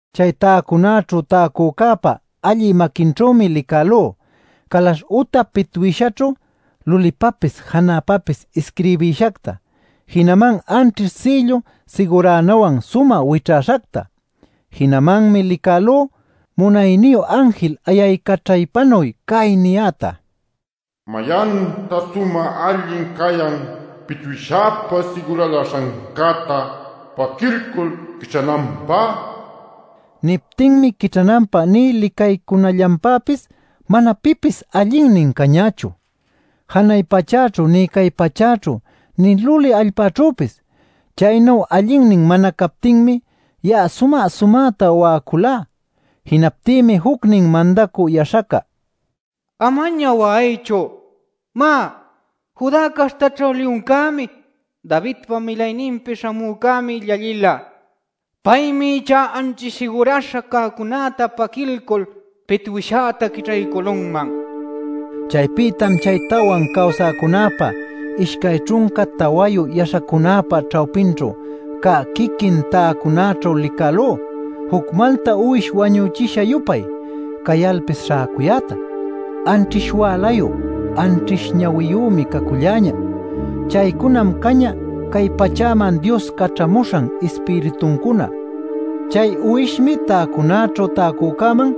Chay täcunaćhu täcücäpa allï maquinćhümi licälú calaśh uta pitwïshaćhu lulïpapis janäpapis isquirbïshacta, jinaman anćhish sïllu siguranawan sumä wićhäśhacta. Jinamanmi licälú munayniyu anjil ayaycaćhaypanuy cay niyäta: “¿Mayantan sumä allin cayan pitwïshäpa siguraläśhancäta paquilcul quićhananpä?” nil. Niptinmi quićhananpä nï licaycunallanpäpis mana pipis allinnin cañächu janay pachäćhu nï cay pachäćhu, nï luli allpäćhüpis. Chaynu allinnin mana captinmi ya'a sumä-sumäta wa'aculá. Jinaptïmi jucnin mandacü yaśhaca: “¡Amaña wa'aychu! Má, ¡Judá caśhtaćhu Liyuncämi, Davidpa Milayninpi Śhamücämi llallïla! Paymi ichá anćhish siguräśha cäcunäta paquiycul pitwïshäta quićhaycülunman” niman. Chaypïtam chay tawan cawsäcunäpa, ishcay ćhunca tawayu yaśhacunäpa ćhawpićhu cä quiquin täcunaćhu licälú juc malta uwish wañüchisha-yupay cayalpis śhäcuyäta. Anćhish wälayu, anćhish ñawiyümi caculläñä. Chaycunam cañä cay pachäman Dios caćhamuśhan Ispirituncuna. Chay uwishmi täcunaćhu täcücäman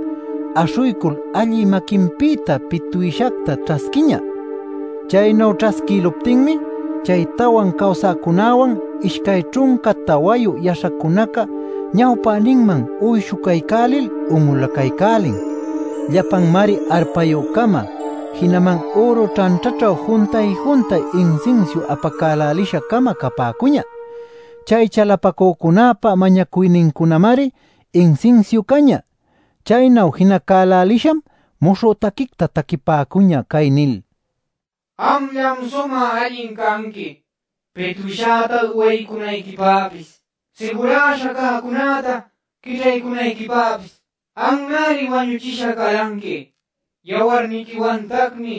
aśhuycul allï maquinpïta pitwïshacta ćhasquiñä. Chaynu ćhasquïluptinmi chay tawan cawsäcunäwan, ishcay ćhunca tawayu yaśhacunaca ñawpäninman uyshucaycälil un'ulacaycälin. Llapanmari arpayü-cama jinaman üru ćhanćhaćhu juntay-juntay insinsiu apacälälisha-cama capäcuñä. Chay chalapacücunäpa mañacuynincunamari insinsiu cañä. Chaynu jinacälälisham muśhü taquicta taquipäcuñä cay nil: “Amllam sumä allin canqui pitwïshäta uywaycunayquipäpis, siguräśha cäcunäta quićhaycunayquipäpis. Anmari wañuchisha calanqui; yawarniquiwantacmi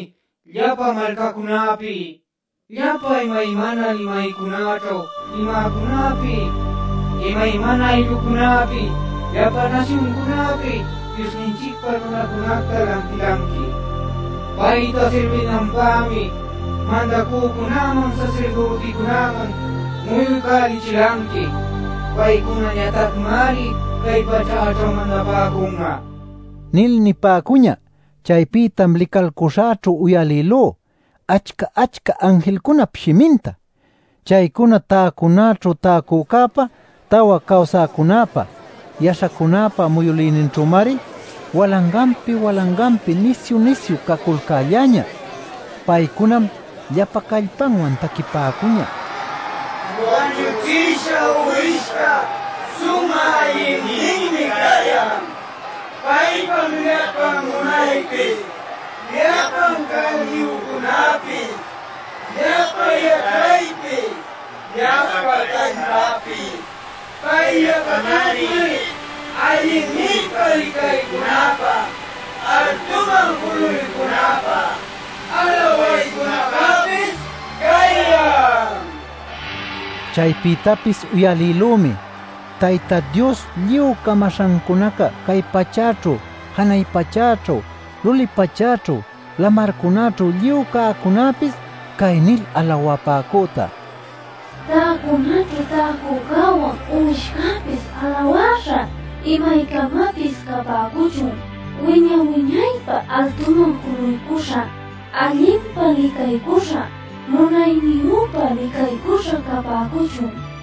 llapa malcacunäpi, llapa imaymana limaycunaćhu limäcunäpi, imaymana ayllucunäpi, llapa nasyuncunäpi Diosninchicpä nunacunacta lantilanqui. Payta sirbinanpämi mandacücunäman sasirdüticunäman muyuycälichilanqui. Paycunañatacmari cay pachäćhu mandapäcun'a” nil nipäcuñä. Chaypïtam licalcuśhäćhu uyalïlú achca-achca anjilcunap shiminta. Chaycuna täcunaćhu täcücäpa, tawa cawsäcunäpa, yaśhacunäpa muyülïninćhümari walanganpi-walanganpi nisyu-nisyu caculcälläñä. Paycunam llapan callpanwan taquipäcuñä: “Wañüchisha Uwishca sumä allinninmi cayan; paypam llapan munaypis, llapan cäniyücunäpis, llapa yaćhaypis, llapa callpapis. Payllatacmari allinninpa licaycunapä, altuman juluycunapä, alawaycunapäpis cayan” nil. Chaypïtapis uyalïlümi Tayta Diospa lluy camaśhancunaca cay pachäćhu, janay pachäćhu, luli pachäćhu, lamarcunäćhu lluy cäcunäpis cay nil alawapäcüta: “Täcunaćhu täcücäwan Uwishcäpis alawäśha imaycamapis capäcuchun, wiña-wiñaypä altuman juluycuśha, allinpa licaycuśha, munayniyüpa licaycuśha capäcuchun” nil.